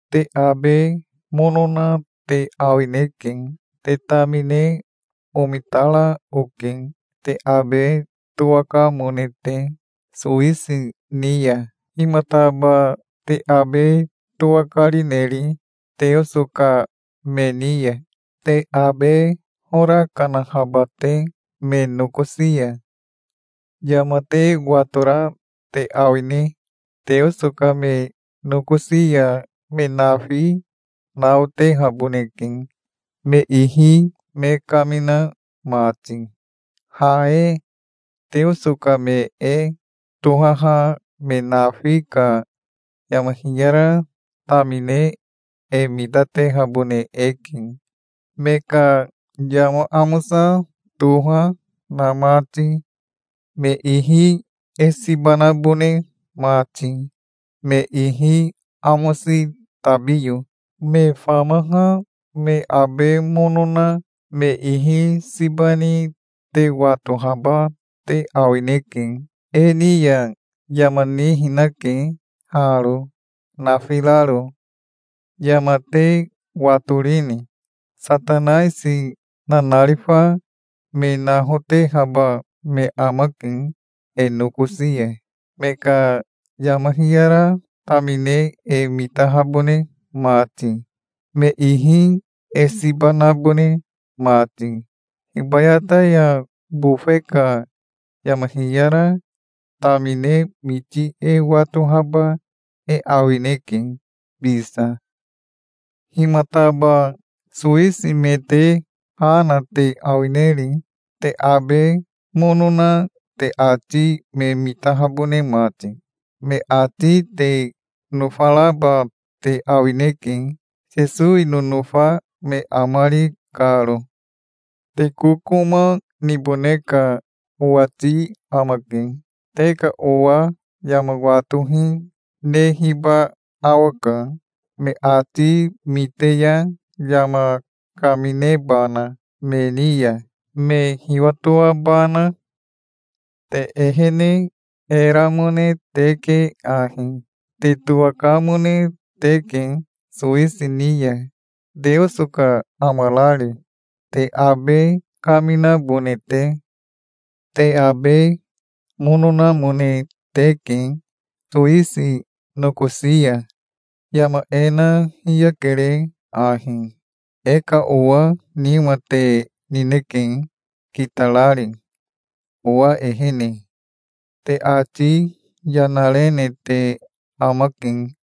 Te abe mono na te awineke. Te tamine omitara oke, te abe towakamone te, sowisi ni ya. Himataba te abe towakarineri, Teoso ka me ni ya, te abe hora kanahaba te me nokosi ya? Yama te watora te awine? Teoso ka me nokosi ya me nafi naotehaboneke, me ihi me kamina mati. Ha e Teoso ka me e tohaha me nafi ka yama hiyara tamine e mitatehabone eke, me ka yama amosa toha, na mati, me ihi e siba nabone mati, me ihi amosi tabiyo. Me famaha me abe mono na me ihi siba ni te watohaba te awineke. E ni ya yama nihinake haro nafiraro. Yama te watorini? Satanaisi nanarifa me nahotehaba me amake e nokosi ya, me ka yama hiyara tamine e mitahabone mati, me ihi e siba nabone mati. Hibayata ya bofe ka yama hiyara tamine miti e watohaba e awineke bisa. Himataba sowisi me te ha na te awineri, te abe mono na te ati me mitahabone mati? Me ati te nofaraba te awineke, Sesowi nonofa me amari karo. Te kokoma nibone ka owati amake. Te ka owa yama watohi nehiba awaka, me ati mite ya yama kaminebana me ni ya, me hiwatoabana. Te ehene e ramone teke ahi. Te towakamone teke sowisi ni ya, Teoso ka amarari, te abe kaminabone te. Te abe mono namone teke sowisi nokosi ya. Yama e na hiyakere ahi. E ka owa nima te nineke kitarari owa ehene. Te ati yana rene te amake.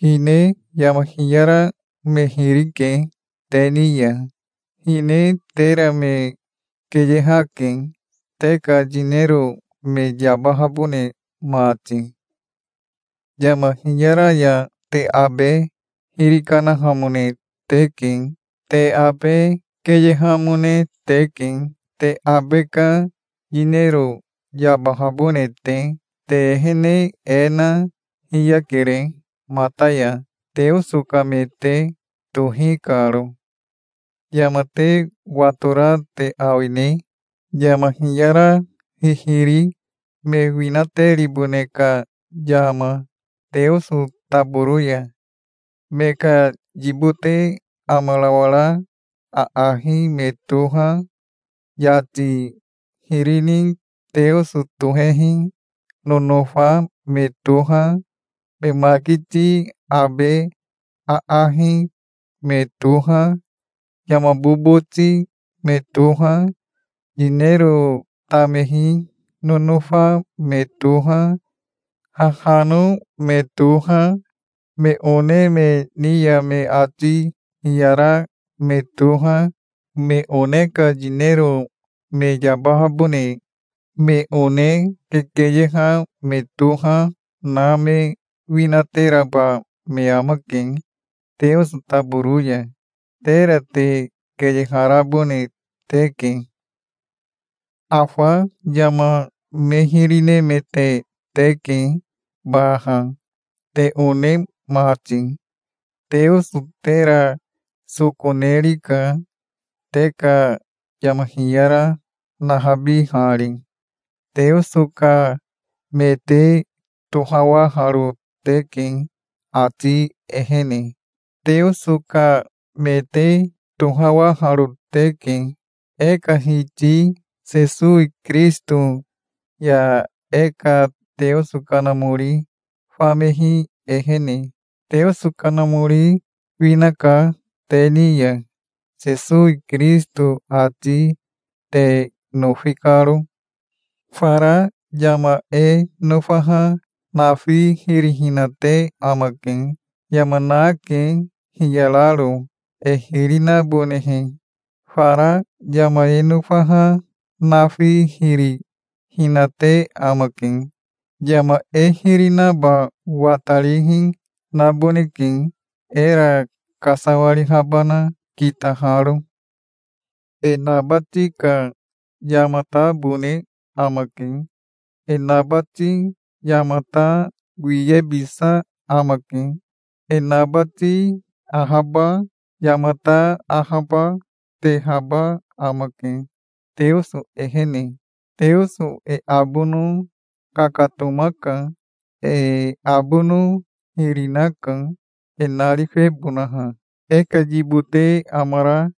Hine yama hiyara me hiri ke te ni ya. Hine tera me keyehake, te ka yinero me yabahabone mati. Yama hiyara ya te abe hiri kanahamone teke. Te abe keyehamone teke, te abe ka yinero yabahabone te. Te ehene e na hiyakere mata ya, Teoso ka me te tohi karo. Yama te watora te awine, yama hiyara hihiri me winateribone ka yama Teoso taboro ya? Me ka yibote amarawara aahi me toha, yati hiri ni teoso tohehi nonofa me toha, me makiti abe aahi me toha, yama boboti me toha, yinero tamehi nonofa me toha, hahano me toha, me one me ni ya me ati hiyara me toha, me one ka yinero me yabahabone me one kekeyeha me toha, na me winateraba me amake Teoso taboro ya. Tera te keyeharabone teke. Afa yama me hiri nemete teke baha, te one mati. Teoso tera soko nerika, te ka yama hiyara nahabihari. Teoso ka me te tohawaharo teke ati ehene. Teoso ka me te tohawaharo teke, e ka Hiti Sesowi Kirisito ya e ka Teoso Kanamori famehi ehene. Teoso Kanamori winaka te ni ya, Sesowi Kirisito ati te nofi karo. Fara yama e nofaha nafi hiri hinate amake. Yama nake, hiyararo, e hiri nabonehe. Fara yama e nofaha nafi hiri hinate amake. Yama e hiri naba watarihi naboneke, era kasawarihabana kitaharo. E nabati ka yamatabone amake. E nabati yamata wiyebisa amake. E nabati ahaba, yamata ahaba, tehaba amake, Teoso ehene. Teoso e abono kakatomaka. E abono hiri, naka, e narifebonaha. E ka yibote amara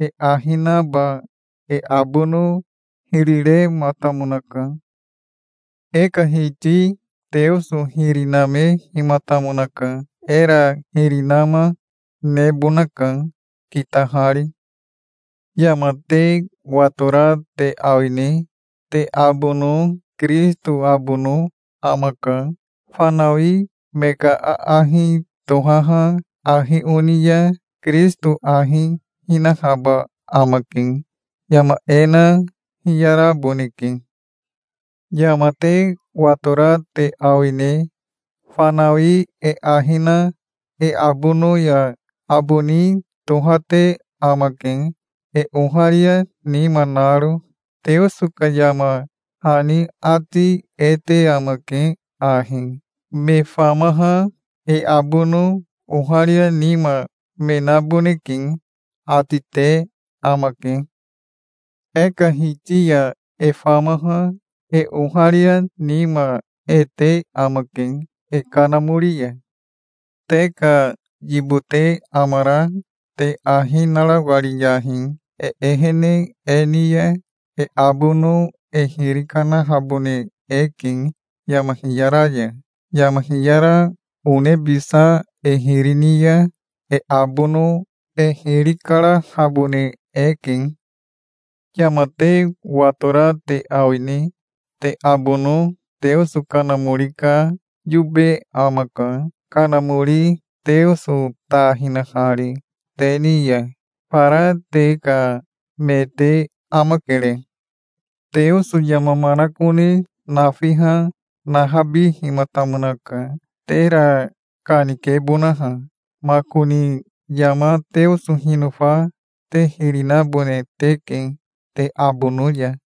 e ahi naba e abono hiri rematamonaka. E ka Hiti Teoso hiri namehimatamonaka. Era hiri nama nebonaka, kitahari. Yama te watora te awine? Te abono Kirisito abono amaka. Fanawi me ka aahi tohaha ahi oni ya Kirisito ahi hinahaba amake. Yama e na hiyaraboneke. Yama te watora te awine? Fanawi e ahi na e abono ya aboni tohate amake, e oharia nima naro. Teoso ka yama hani ati e te amake ahi: "Me famaha e abono oharia nima me naboneke", ati te amake. E ka Hiti ya e famaha e oharia nima e te amake, e kanamori ya. Te ka yibote amara te ahi narawariyahi. E ehene e ni ya e abono e hiri kanahabone eke, yama hiyara ya. Yama hiyara onebisa e hiri ni ya e abono e hiri karahabone eke. Yama te watora te awine? Te abono Teoso Kanamori ka yobe amaka, Kanamori Teoso ta hinahari te ni ya. Fara te ka me te amakere. Teoso yama manakone nafiha nahabihimatamonaka, tera kanikebonaha. Makoni yama Teoso hinofa te hiri nabone teke, te abono ya.